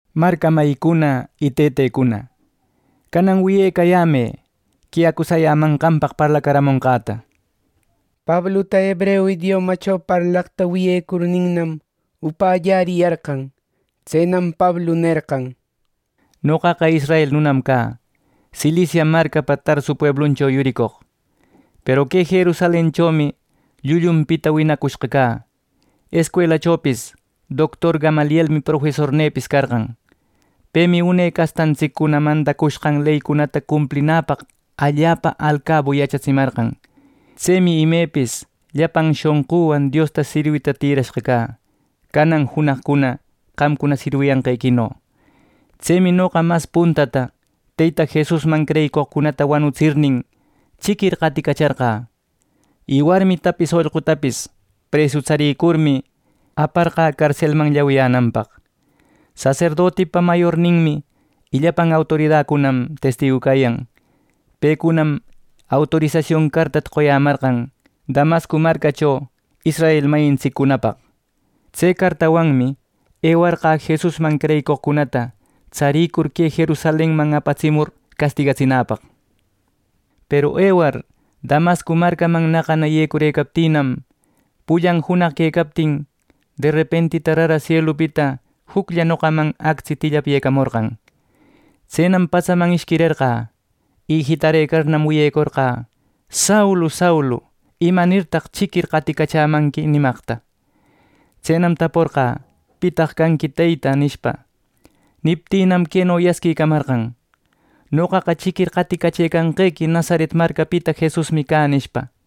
—Marca mayïcuna y tëtecuna, canan wiyecayämë que acusayämanqanpaq parlacaramonqäta —nishpa. Pabluta hebreu idiomacho parlaqta wiyecurninnam, upällariyarqan. Tsenam Pablu nerqan: “Noqaqa israel nunam cä, Cilicia marcapa Tarsu puebluncho yuricoq. Peru que Jerusalenchomi llullunpita winacushqa cä, escuelachopis doctor Gamalielmi profesornïpis carqan. Pemi une castantsiccuna mandacushqan leycunata cumplinäpaq allapa alcabu yachatsimarqan. Tsemi imepis llapan shonqüwan Diosta sirwita tïrashqa cä, canan junaqcuna qamcuna sirwiyanqequino. Tsemi noqa mas puntata, Teyta Jesusman creyicoqcunata wanutsirnin, chiquir qaticacharqä; y warmitapis ollqutapis presu tsarircurmi, aparqä carselman llawiyänanpaq. Saserdoticunapa mayorninmi y llapan autoridacunam testigu cayan. Pecunam autorisasion cartata qoyämarqan Damasco marcacho israel mayintsiccunapaq. Tse cartawanmi ewarqä Jesusman creyicoqcunata tsarïcur que Jerusalenman apatsimur castigatsinäpaq. “Peru ewar Damasco marcaman naqana yecurëcaptïnam, pullan junaq quecaptin derepentita rara sielupita juclla noqaman actsi tillapyëcamorqan. Tsenam patsaman ishquirerqä, y jitarëcarnam wiyecorqä: ‘Saulu, Saulu ¿imanirtaq chiquir qaticachämanqui?’ nimaqta. Tsenam taporqä: ‘¿Pitaq canqui Teyta?’ nishpa. Niptïnam, queno yasquimarqan: ‘Noqaqa chiquir qaticachëcanqequi Nazaret marcapita Jesusmi cä’ nishpa.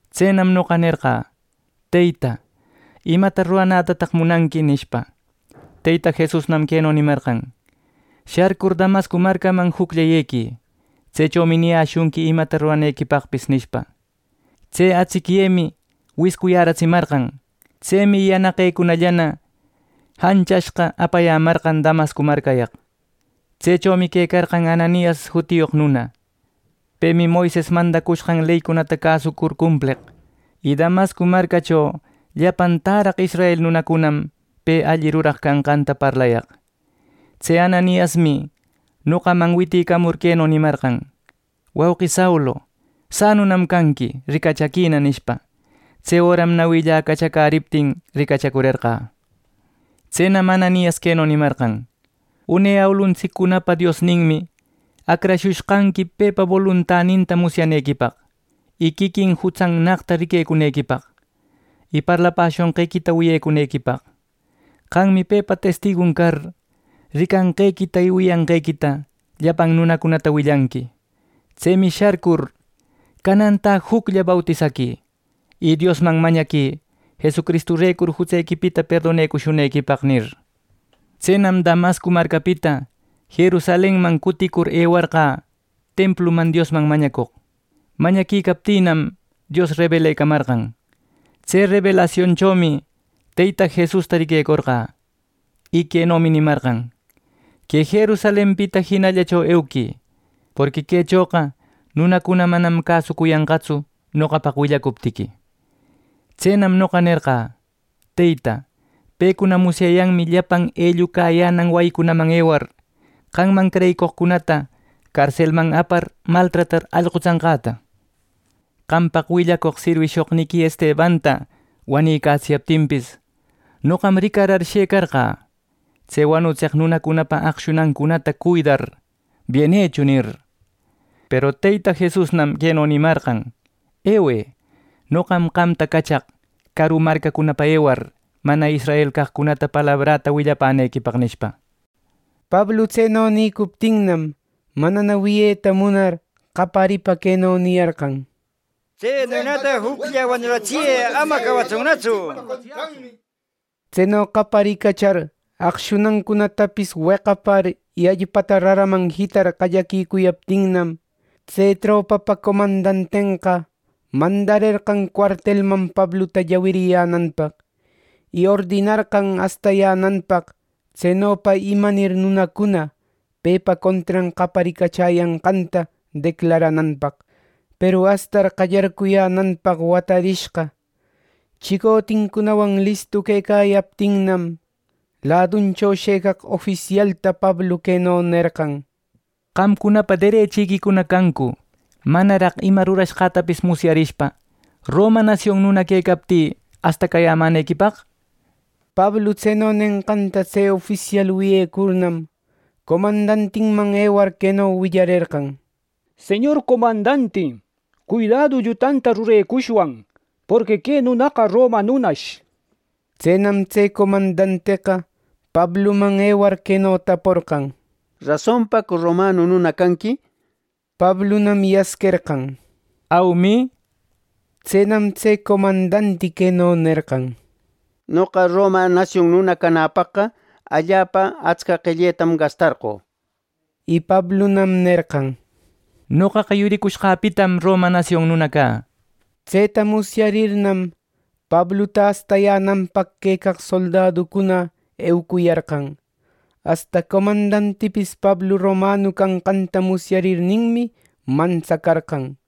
Tsenam noqa nerqä ‘Teyta, ¿imata ruranätataq munanqui?’ nishpa. Teyta Jesusnam queno nimarqan: ‘Sharcur Damasco marcaman juclla yequï. Tsechomi niyäshunqui imata ruranequipaqpis’ nishpa. Tse atsicyëmi wiscuyäratsimarqan. Tsemi yanaqecunallana janchashqa apayämarqan Damasco marcayaq. “Tsechomi quecarqan Ananias jutiyoq nuna. Pemi Moises mandacushqan leycunata cäsucur cumpleq, y Damasco marcacho llapan täraq israel nunacunam pe alli ruraq canqanta parlayaq. Tse Ananiasmi nopäman witïcamur queno nimarqan: ‘Wauqi Saulu, sanunam canqui, ricachaquina, nishpa. Tse öram nawïlla cachacäriptin ricachacurerqä. Tsenam Ananias queno nimarqan: ‘Une awiluntsiccunapa Diosninmi acrashushqanqui pepa boluntaninta musyanequipaq, y quiquin Jutsannaqta riquecunequipaq, y parlapäshonqequita wiyecunequipaq. Qammi pepa testigun car ricanqequita y wiyanqequita llapan nunacunata willanqui. Tsemi sharcur canantä juclla bautisaquï, y Diosman mañaquï Jesucristurecur jutsequipita perdonecushunequipaq’ nir. “Tsenam Damasco marcapita Jerusalenman cutïcur ewarqä templuman Diosman mañacoq. Mañaquicaptïnam, Dios rebelecamarqan. Tse rebelasionchomi Teyta Jesusta riquecorqä, y quenomi nimarqan: ‘Que Jerusalenpita jinallacho euquï, porqui quechoqa nunacuna manam cäsucuyanqatsu noqapaq willacuptiqui.’ Tsenam noqa nerqä: ‘Teyta, pecuna musyayanmi llapan ellucayänan wayicunaman ewar, qamman creyicoqcunata carselman apar maltratar allqutsanqäta.’ Qampaq willacoq sirwishoqniqui Estebanta wanïcätsiyaptinpis, noqam ricarar shëcarqä, tse wanutseq nunacunapa aqshunancunata cuidar, ‘Bienecho’ nir. Peru Teyta Jesusnam queno nimarqan: ‘Ewë, noqam qamta cachaq caru marcacunapa ewar mana israel caqcunata palabräta willapänequipaq’” nishpa. Pablu tseno nïcuptinnam, manana wiyeta munar qayaripa queno niyarqan: —¡Tse nunata juclla wanuratsiyë! ¡Amana cawatsunnatsu! —nishpa. Tseno qaparicachar aqshunancunatapis weqapar y allpata raraman jitar qallaquicuyaptinnam, tse tropapä comandantenqa mandarerqan cuartelman Pabluta llawiyänanpaq. Y ordinarqan astayänanpaq tsenopa imanir nunacuna pepa contran qaparicachäyanqanta declarananpaq. Peru astar qallarcuyänanpaq watarishqa, chicotincunawan listu quecayaptinnam, laduncho shëcaq ofisialta Pablu queno nerqan: —¿Qamcunapa derechiquicuna cancu, manaraq ima rurashqätapis musyarishpa roma nasion nuna quecaptï astacayämänequipaq? Pablu tseno nenqanta tse ofisial wiyecurnam, comandantiman ewar queno willarerqan: —Señor comandanti, cuidädu llutanta rurecushwan, porqui que nunaqa roma nunash. Tsenam tse comandanteqa Pabluman ewar queno taporqan: —¿Rasonpacu romanu nuna canqui? —nishpa. Pablunam yasquerqan: —Aumi —nishpa. Tsenam tse comandanti queno nerqan: —Noqa roma nasion nuna canäpaqqa allapa atsca qelletam gastarqö —nishpa. Y Pablunam nerqan: —Noqaqa yuricushqäpitam roma nasion nuna cä. Tseta musyarirnam, Pabluta astayänanpaq quecaq soldaducuna eucuyarqan, asta comandantipis Pablu romanu canqanta musyarirninmi mantsacarqan,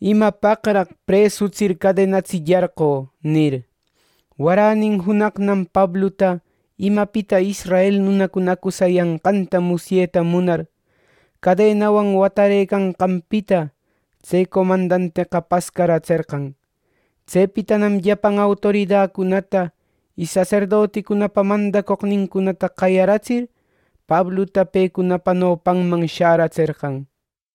¿Imapaqraq presutsir cadenatsillarqö? —nir. Waränin junaqnam Pabluta imapita israel nunacuna acusayanqanta musyeta munar, cadenawan watarëcanqanpita tse comandanteqa pascaratserqan. Tsepitanam llapan autoridacunata y saserdoticunapa mandacoqnincunata qayaratsir, Pabluta pecunapa nopanman sharatserqan.